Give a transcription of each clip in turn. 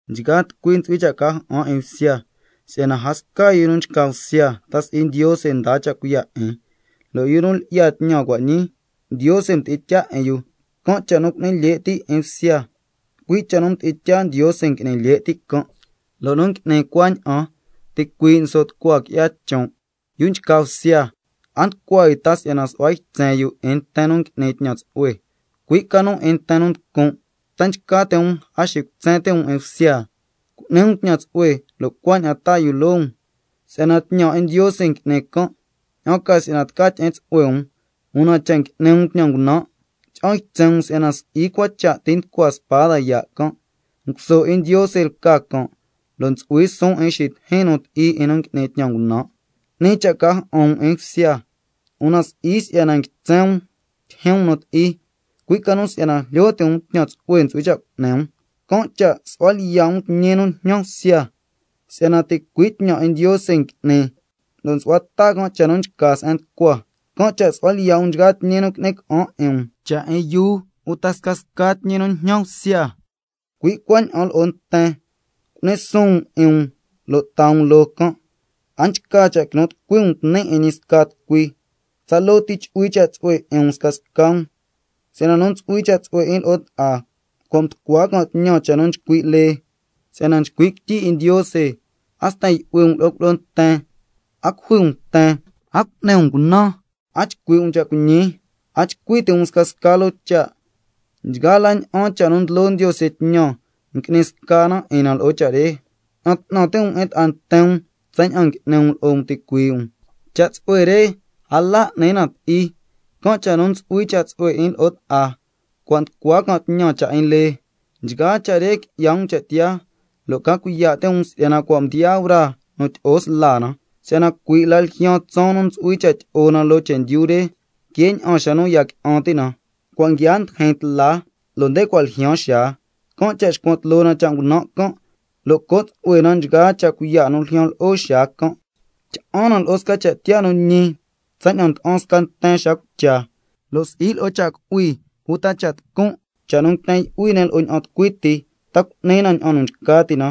Nchgaa tucui ntsu'hui cha' ca ja'an 'in bsya, si'yana a sca yu nu nchca bsya ta si'i Ndiose ndaa cha' cuiya' 'in, lo' yu nu lyi'ya tñan cua' ñii, Ndiose mdi'in tyaa 'in yu. Can' cha' nu cu'ni lye' ti' 'in bsya, cui' cha' nu mdi'in tyaa Ndiose ngui'ni lye' ti' can', lo' nu ngui'ni cuaña'an, ticuii' nso' tucua qui'ya chon'. Yu nchca bsya, a nducua yu ta si'yana su'hua ytsen yu 'in nten nu ngui'ni tñan tsu'hue, cui' ca nu 'in nten nu nducun'. ¿Ta nchca ti' um a xicutsen ti' um 'in bsya? Cu'ni um tñan tsu'hue lo' cuaña'an taa yu loo um, si'yana tñan 'in Ndiose ngui'ni can', ña'an ca si'yana tca tyi'in tsu'hue um. Una cha' ngui'ni um tñan ngunan', tyi'an ytsen um si'yana si'i cua cha' ti nducua spada yaa' can'. Nguso 'in Ndiose lca can', lo' ntsu'hui suun 'in xitijin nu ti'i 'in nu ngui'ni tñan ngunan'. 'Ni cha' ca ja'an um 'in bsya, una si'i si'yana nguitsen um tyijyin um nu ti'i, cui' ca nu si'yana jlyo ti' um tñan tsu'hue ntsu'hui cha' cu'ni um. Can' cha' nsu'hua lyiya' um tñi nu njñan bsya, si'yana ticui' tñan 'in Ndiose ngui'ni lo' nsu'hua ta can' cha' nu nchca se'en nducua. Can' cha' su'hua lyiya' um nchgaa tñi nu ngui'ni ca'an 'in um, cha' 'in yuu uta scasca tñi nu njñan bsya. Cui' cuaña'an lo'o nten, cu'ni suun um 'in um, lo' taa um loo can'. A nchca cha' quinu tucui um tni' 'in ñi sca tucui, tsaloo ti chu'hui cha' tsu'hue 'in um scasca um, si'yana nu ntsu'hui cha' tsu'hue 'in lo'o ta'a cua' mducua can' tñan cha' nu nchcui' lee. Si'yana nchcui' quityi 'in Ndiose: —A sten yu'hui um lo'o cuilyi'o nten, a cujui um nten, a cu'ni um cunan, a chcui' um cha' cuiñi, a chcui ti' um scasca loo cha'—. Nchgaa la ña'an cha' nu ndlo Ndiose tñan ngui'ni sca na 'in na lo'o cha' re: —Ña'an 'tnan ti' um 'in ta'a nten um tsaña'an n'ni um lo'o um ticuii' um—. Cha' tsu'hue re a la n'ni na ti'i, can' cha' nu ntsu'hui cha' tsu'hue 'in lo'o ta'a, cua' nducua can' tñan cha' 'in lee. Nchgaa cha' re qui'ya um cha' tiyaa, lo' ca cuiya' ti' um si'yana cua' mdiyaa braa nu tyi'o sla na, si'yana cui' la ljyaan tsaan nu ntsu'hui cha' tyi'o na loo chendyu re que ña'an xa nu ya qui'an ti' na. Cua' nguiaa ndijin tla lo' nde cua' ljyaan xaa, can' cha' xcuan tloo na cha' ngunan' can', lo' co' tsu'hue na nchgaa cha' cuiya' nu ljyan lo'o xaa can'. Tyi'an na lo'o sca cha' tiyaa nu ñi tsaña'an nda'an sca nten xa cucha, lo' si'i lo'o cha' cu'hui uta cha' tucun', cha' nu nguiten yu'hui ne' lo'o ña'an tucui ti, ta cu'ni na ña'an nu nchca ti' na,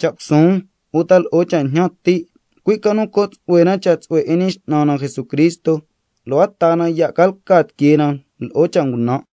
cha' cusuun uta lo'o cha' njñan ti', cui' ca nu co' tsu'hue na cha' tsu'hue 'in Ñi X'nan na Jesucristo, lo' a taa na ya' ca lca tiquee na lo'o cha' ngunan'.